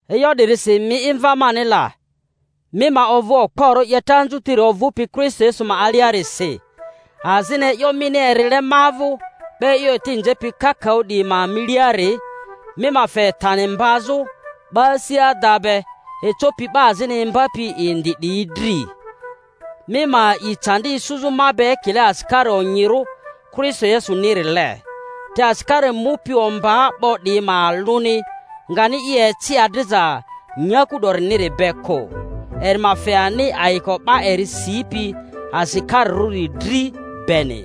E'yo 'dirisi mi'i, mva mani la, mi ma ovᴜ okporᴜ 'yeta anzutiri ovᴜpi Kristo Yesu ma aliarisi, azini e'yo mini erile ma vᴜ 'ba e'yo eti nzepi kakaᴜ 'diyi ma miliari, mi ma fe tani mbazᴜ 'ba asi ada be ecopi 'ba azini imbapi indi 'diyi dri. Mi ma a'i candi isuzᴜ ma be ekile asikari onyirᴜ Kristo Yesunirile. Te asikari mupi ombaa 'bo 'diyi ma alᴜni ngani i eci adriza nyaku 'doriniri be kᴜ, eri ma fe ani ayiko 'ba eri sipi asikarirᴜri dri beni.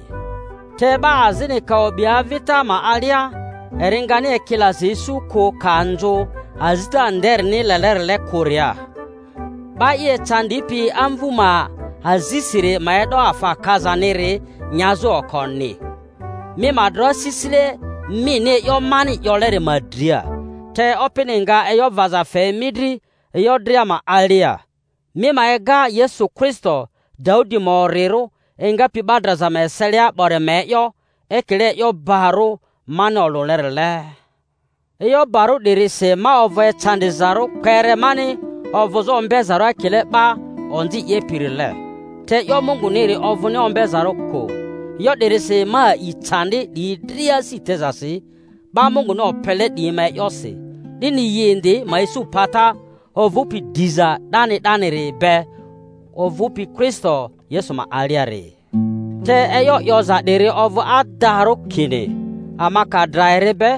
Te 'ba azini ka o'bi avita ma alia, eri ngani ekilaza isu kᴜ ka nzᴜ azita nderini lelerile kᴜria. 'Ba i ecandipi amvu ma azisiri ma e'do afa kazaniri nyazᴜ okoni. Mi ma dro asisile mini e'yo mani 'yoleri ma dria, te Opini nga e'yo vaza fe mi dri e'yo dria ma alia. Mi ma ega Yesu Kristo, Daudi ma orirᴜ, engapi 'ba draza ma eselia 'bori ma e'yo, ekile e'yo barᴜ mani olᴜlerile; e'yo barᴜ 'dirisi ma ovᴜ ecandizarᴜ kpere mani ovᴜzᴜ ombezarᴜ ekile 'ba onzi 'yepirile. Te e'yo Munguniri ovᴜni ombezarᴜ kᴜ. E'yo 'dirisi ma a'i candi 'diyi dria asi tezasi 'ba Munguni opele 'diyi ma e'yosi, 'dini yi indi ma isu pata ovᴜpi diza 'dani 'daniri be ovᴜpi Kristo Yesu ma aliari. Te e'yo 'yoza 'diri ovᴜ adarᴜ, kini: Ama ka dra eri be,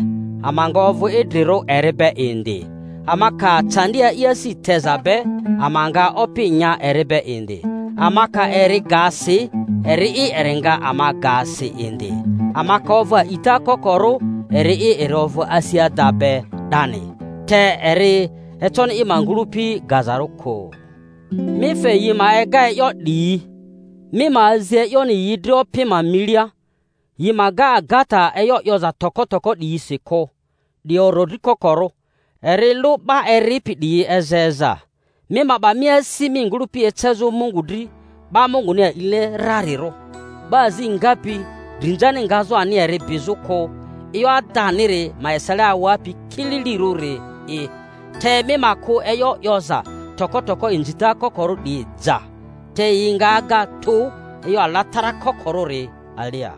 ama nga ovᴜ idrirᴜ eri be indi; ama ka candi a'i asi teza be, ama nga opi nya eri be indi; ama ka eri ga si, eri'i eri nga ama ga si indi; ama ka ovᴜ a'ita kokorᴜ, eri'i eri ovᴜ asi ada be 'dani— te eri econi i ma ngᴜlᴜpi gazarᴜ kᴜ. Mi fe yi ma ega e'yo 'diyi, mi ma azi e'yoni yi dri Opi ma milia, yi ma ga agata e'yo 'yoza toko toko 'diyisi kᴜ, 'di orodri kokorᴜ, eri lᴜ 'ba eripi 'diyi eza eza. Mima'ba mi asi mi ngᴜlᴜpi ecezᴜ Mungu dri 'ba Munguni a'ile rarirᴜ, 'ba azi ngapi drinzani ngazᴜ ani eri bizᴜ kᴜ, e'yo adaniri ma esele awapi kililirᴜrili'i. Te mi ma kᴜ e'yo 'yoza toko toko inzita kokorᴜ 'diyi ja, te yi nga aga tᴜ e'yo alatarakokorᴜri alia,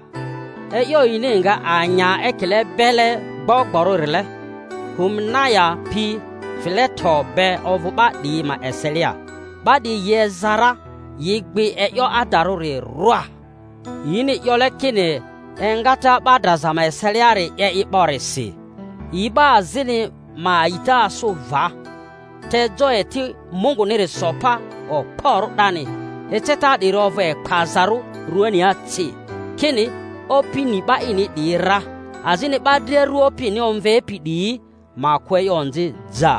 e'yo yini nga anya ekile bele gbogborᴜ-rile. Humenaya pi Fileto be ovᴜ 'ba 'diyi ma eselia; 'ba 'diyi yi eza ra, yi gbi e'yo adarᴜri rwa, yini 'yole kini engata 'ba draza ma eseliari 'ye i 'borisi. Yi 'ba azini ma a'ita asᴜ va. Te jo eti Munguniri so pa okporᴜ 'dani, eceta 'diri ovᴜ ekpazarᴜ ruania ci, kini: Opi ni 'ba ini 'diyi ra, azini 'Ba dria ru Opini omvepi 'diyi ma kᴜ e'yo onzi ja.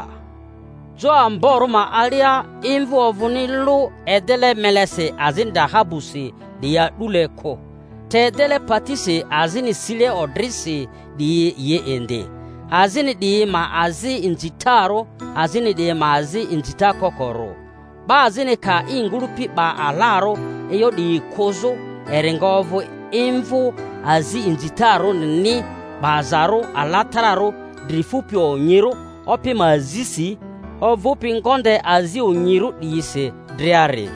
Jo amborᴜ ma alia imvᴜ ovᴜni lᴜ edele melesi azini dahabusi 'diyi a'dule kᴜ, te edele patisi azini sile odrisi 'diyi yi indi; azini 'diyi ma azi inzitarᴜ, azini 'diyi ma azi inzita kokorᴜ. 'Ba azini ka i ngᴜlᴜpi 'ba alarᴜ e'yo 'diyi kᴜzᴜ, eri nga ovᴜ imvᴜ azi inzitarᴜrini, 'bazarᴜ alatararᴜ, dri fupi onyirᴜ opi ma azisi, ovᴜpi ngonde azi onyirᴜ 'diyisi driari.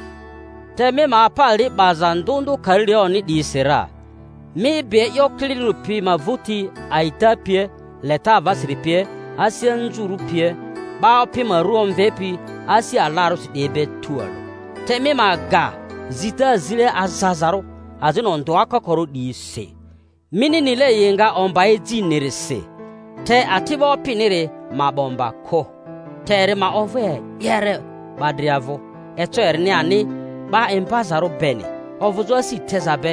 Te mi ma apa li 'baza ndᴜ ndᴜ karilaᴜni 'diyisi ra, mi bi e'yo kililirᴜri pi ma vᴜti, a'ita pie, leta avasiri pie, asi anzurᴜ pie, 'ba Opi ma ru omvepi asi alarᴜsi 'diyi be tualᴜ. Te mi ma ga zita zile azazarᴜ azini ondᴜa kokorᴜ 'diyi si, mini nile yi nga omba ejinirisi. Te ati'bo Opiniri ma 'ba omba kᴜ, te eri ma ovᴜ e'yere 'ba dria vᴜ, eco erini ani 'ba imbazarᴜ beni, ovᴜzᴜ asi teza be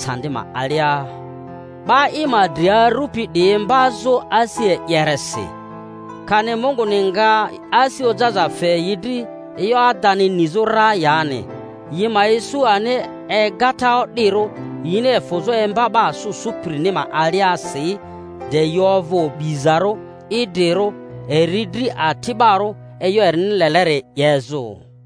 candi ma alia, 'ba i ma dri arᴜpi 'diyi imbazᴜ asi e'yeresi. Kani Munguni nga asi ojaza fe yi dri e'yo adani nizᴜ ra yani, yi ma isu ani egata o'dirᴜ, yini efᴜzᴜ emba 'ba asᴜ sᴜpirini ma aliasi, de yi ovᴜ obizarᴜ idrirᴜ eri dri ati'barᴜ e'yo erini leleri 'yezᴜ.